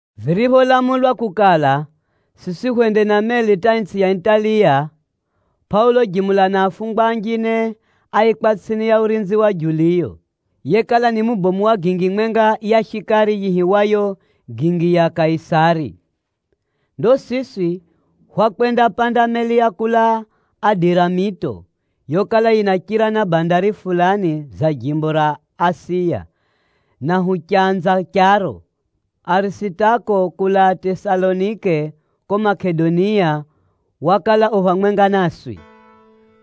Viripholamulwa kukala, siswi hwende na meli hata itsʼi ya Italiya, Pʼaulo jimula na afungwa anjine áikwa tsʼini ya urinzi wa Juliyo, yekala ni mubomu wa gingi mwenga ya shikari yiihiwayo “Gingi ya Kaisari.” Ndo siswi hwakwendapanda meli ya kulaa Adiramito, yokala yinachira na bandari fulani za jimbo ra Asiya, na huchanza charo. Arisitako kulaa Tesalonike ko Makedonia, wakala u phamwenga naswi.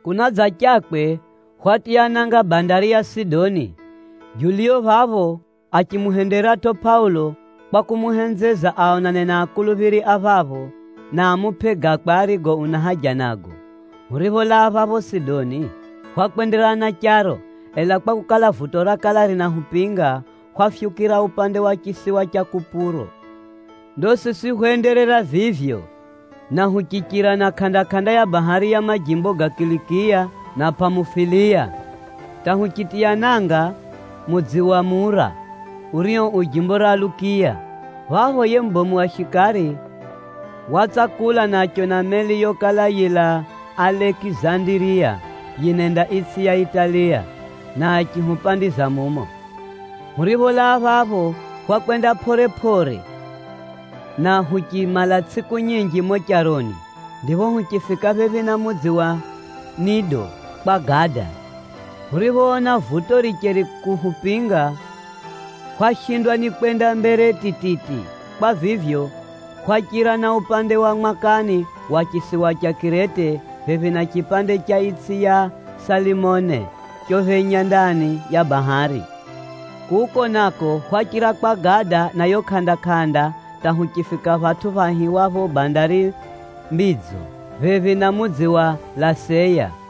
Kunadzachakwe, hwatiya nanga bandari ya Sidoni. Juliyo phapho achimuhenderatʼo Pʼaulo kwa kumuhenzeza aonane na akuluphiri a phapho, na amupʼe gakwe arigo una haja nago. Huripholaa phapho Sidoni, hwakwenderera na charo, ela kwakukala, vuto rakala rinahupinga, hwafyukira upande wa chisiwa cha Kupuro. Ndo siswi hwenderera vivyo, na huchichira na kʼanda-kʼanda ya bahari ya majimbo ga Kilikiya na Pʼamufuliya, hata huchendatiya nanga mudzi wa Mura, urio u jimbo ra Lukiya. Phapho yiye mubomu wa shikari watsakula na achiona meli yokala yilaa Alekizandiriya yinenda itsʼi ya Italiya, na achihupandiza mumo. Huripholaa phapho, hwakwenda pʼore-pʼore, na huchimala tsʼiku nyinji mumo charoni, ndipho huchifika phephi na mudzi wa Nido kwa gada. Huriphoona vuto richeri kuhupinga, hwashindwa ni kwenda mbere tititi. Kwa vivyo, hwachira na upande wa mwakani wa chisiwa cha Kirete phephi na chipande cha itsʼi cha Salimone chophenya ndani ya bahari. Kuko nako hwachira kwa gada na yo kʼanda-kʼanda hata huchifika phatʼu phaihiwapho Bandari Mbidzo, phephi na mudzi wa Laseya.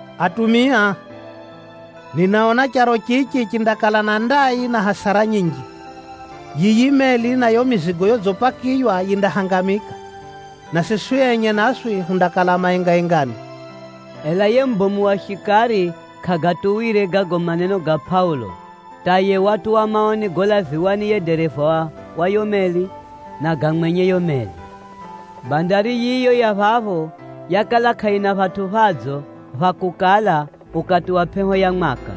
“Atumia, ninaona charo chichi chindakala na ndai, na hasara nyinji. Yiyi meli na yo mizigo yodzipakiywa yindahangamika, na siswi enye naswi hundakala maengaengani.” Ela yiye mubomu wa shikari kʼagatuwire gago maneno ga Pʼaulo, hata yiye watuwa maoni golaviwa ni yiye dereva wa yo meli, na ga mwenye yo meli. Bandari yiyo ya phapho yakala kʼayina phatʼu phadzo pha kukala ukati wa pʼeho ya mwaka.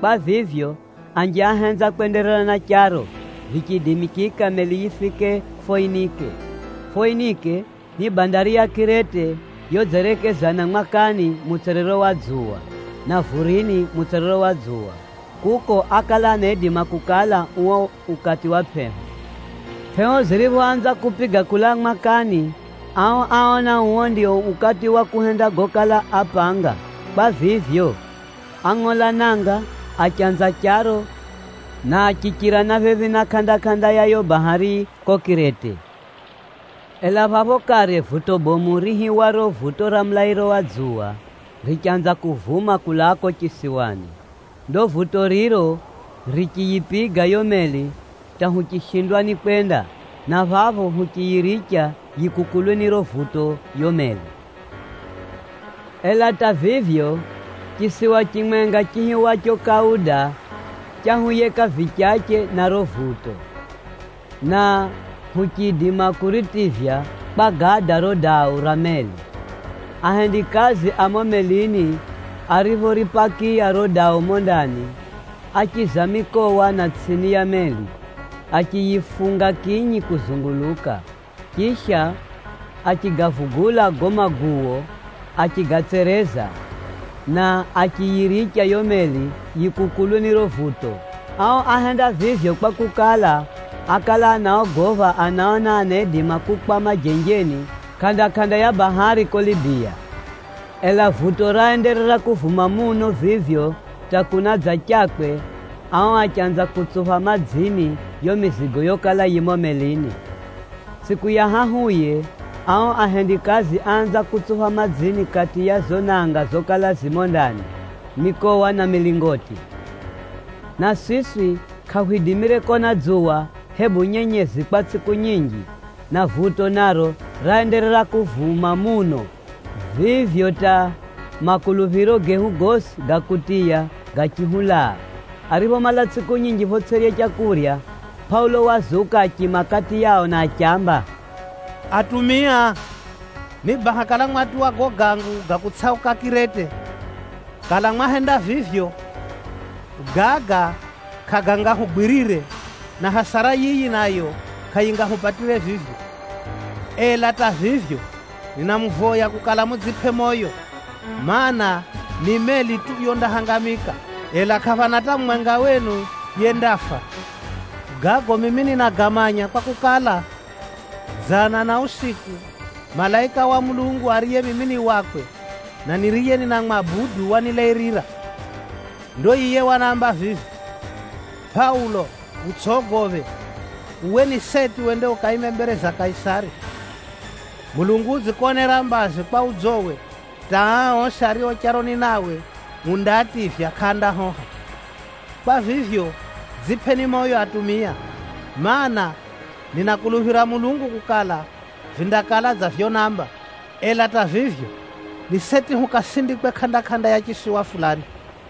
Kwa vivyo, anji áhenza kwenderera na charo, vichiidimikika meli yifike Foinike. Foinike ni bandari ya Kirete yodzerekeza mwakani mutswerero wa dzuwa, na vurini mutswerero wa dzuwa. Kuko ákala anaidima kukala uo ukati wa pʼeho. Pʼeho ziriphoanza kupiga kulaa mwakani, ao áona uo ndio ukati wa kuhenda gokala apanga. Kwa vivyo, ángʼola nanga, achanza charo na achichira na phephi na kʼanda-kʼanda ya yo bahari ko Kirete. Ela phapho kare vuto bomu riihiwaro, “Vuto ra mulairo wa dzuwa,” richanza kuvuma kulaa ko chisiwani. Ndo vuto riro richiyipiga yo meli hata huchishindwa ni kwenda, na phapho huchiyiricha yikukulwe ni riro vuto yo meli. Ela hata vivyo, chisiwa chimwenga chiihiwacho Kauda, chahuyeka vichache na riro vuto, na huchiidima kuritivya kwa gada riro dau ra meli. Ahendikazi a mumo melini ariphoripakiya riro dau mumo ndani, áchiza mikowa na tsʼini ya meli, achiyifunga kinyi kuzunguluka. Chisha, achigavugula gago maguwo, achigatsereza, na achiyiricha yo meli yikukulwe ni riro vuto. Ao áhenda vivyo kwakukala, ákala anaogopha anaona anaidima kukwama jenjeni, kʼanda-kʼanda ya bahari ko Libiya. Ela vuto raenderera kuvuma muno vivyo hata kunadzachakwe, ao achanza kutsupha madzini yo mizigo yokala yi mumo melini. Tsʼiku ya hahuye, ao ahendikazi áanza kutsupha madzini kati ya zo nanga zokala zi mumo ndani, mikowa na milingoti. Na siswi kʼahwidimire kona dzuwa, hebu nyenyezi kwa tsʼiku nyinji, na vuto naro raenderera kuvuma muno vivyo hata makuluphiro gehu gosi ga kutiya gachihulaa. Ariphomala tsʼiku nyinji photsʼirya leu, Pʼaulo wazuka achiima kati yao na achiamba, “Atumia, ni baha kala mwatuwa gago gangu ga kutsʼauka Kirete. Kala mwahenda vivyo, gaga kʼagangahugwirire, na hasara yiyi nayo, kʼayingahupatire vivyo. Ela hata vivyo, ninamuvoya kukala mudzipʼe moyo, mana, ni meli tu yondahangamika, ela kʼaphana hata mumwenga wenu yendafa. Gago mimi ninagamanya kwakukala, dzana na usiku malaika wa Mulungu ariye mimi ni wakwe, na niriye ninamwabudu wanilairira. Ndo yiye wanamba vivi, ‘Pʼaulo utsʼogophe! Uwe ni seti wende ukaime mbere za Kaisari. Mulungu udzikonera mbazi kwa udzowe hata aa osi ario charoni nawe undaativya kʼaandahoha.’ Kwa vivyo, dzipʼeni moyo atumia, mana, ninakuluphira Mulungu kukala, vindakala dza vyonamba. Ela hata vivyo, ni seti hukasindikwe kʼanda-kʼanda ya chisiwa fulani.”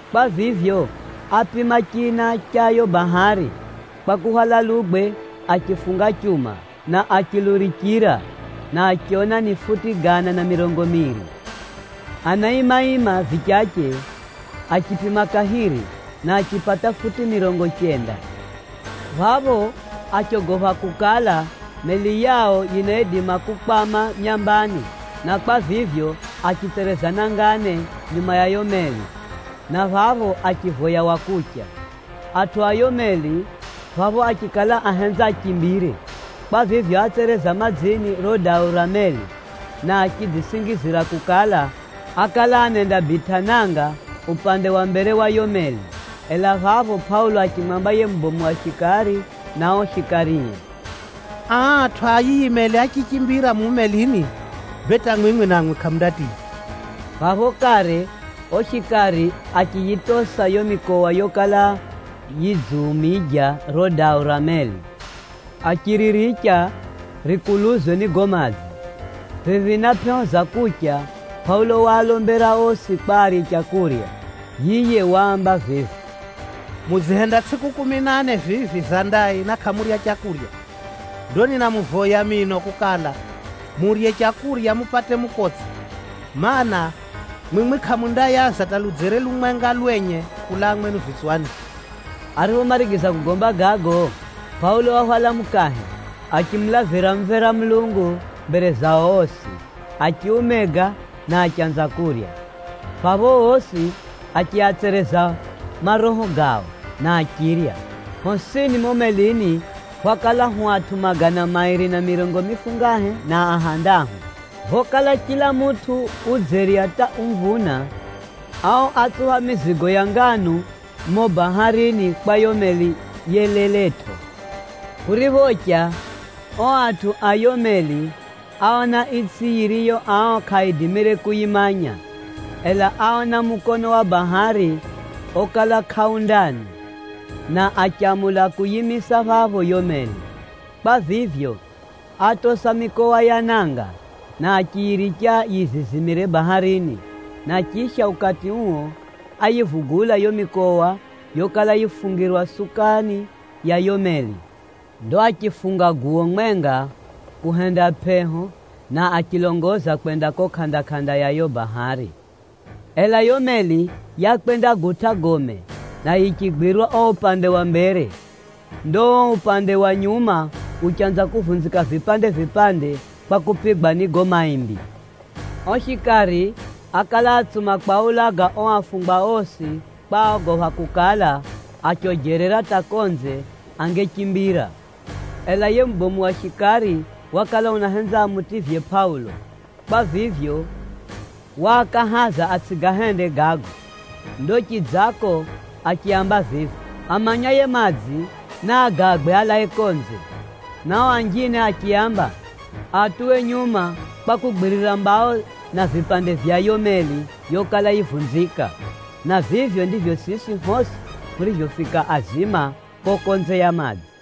Kwa vivyo, ápima china cha yo bahari, kwa kuhwala lugwe achifunga chuma, na achilurichira, na achiona ni futi gana na mirongo miiri. Anaima-ima vichache, achipima kahiri, na achipata futi mirongo chenda. Phapho achogopha kukala, meli yao yinaidima kukwama myambani, na kwa vivyo, achitsereza nanga ne, nyuma ya yo meli, na phapho achivoya wa kucha. Atʼu a yo meli, phapho achikala ahenza achimbire. Kwa vivyo, átsereza madzini riro dau ra meli, na achidzisingizira kukala, ákala anendabitʼa nanga upande wa mbere wa yo meli. Ela phapho Pʼaulo achimwamba yiye mubomu wa shikari na o shikarie, “Aa atʼu a yiyi meli achichimbira mumu melini, bee hata mwimwi namwi kʼamundatiya.” Phapho kare o shikari achiyitosa yo mikowa yokala yidziumija riro dau ra meli, achiriricha rikuluzwe ni gago madzi. Phephi na pʼeho za kucha, Pʼaulo waalombera osi kwa arye leu. Yiye waamba vivi, “Mudzihenda tsʼiku kumi na ne vivi za ndai, na kʼamurya leu. Ndo ninamuvoya mino kukala, murye leu mupate mukotse. Maana, mwimwi kʼamundayaza hata ludzere lumwenga lwenye kulaa mwenu vitswani.” Ariphomarigiza kugomba gago, Pʼaulo wahwala mukahe, achimulavira mumvera Mulungu mbere zao osi, achiumega na achanza kurya. Phapho osi achiatsereza maroho gao, na achirya. Hosini mumo melini hwakala hu atʼu magana mairi na mirongo mifungahe na ahandahu. Phokala chila mutʼu udzerya hata umvuna, ao átsupha mizigo ya nganu mumo baharini kwa yo meli yeleletʼo. Kuriphocha, o atʼu a yo meli áona itsʼi yiriyo ao kʼaaidimire kuyimanya. Ela áona mukono wa bahari okala kʼau ndani, na achamula kuyiimisa phapho yo meli. Kwa vivyo, átosa mikowa ya nanga, na achiyiricha yizizimire baharini. Na chisha, ukati uo áyivugula yo mikowa yokala yifungirwa sukani ya yo meli. Ndo achifunga guwo mwenga kuhenda pʼeho, na achilongoza kwenda ko kʼanda-kʼanda ya yo bahari. Ela yo meli yakwendagutʼa gome, na yichigwirwa o upande wa mbere. Ndo o upande wa nyuma uchanza kuvunzika vipande-vipande kwa kupigwa ni gago maimbi. O shikari ákala atsuma kwaulaga o afungwa osi kwa áogopha kukala, achojerera hata konze, angechimbira. Ela yiye mubomu wa shikari wakala unahenza amutivye Pʼaulo. Kwa vivyo, waakahaza atsʼigahende gago. Ndo chidzako achiaamba vivi, “Amanyaye madzi, naagagwe alae konze.” Na o anjine achiaamba, aatuwe nyuma kwa kugwiririra mbao na vipande vya yo meli yokala yivunzika. Na vivyo ndivyo siswi hosi hurivyofika azima ko konze ya madzi.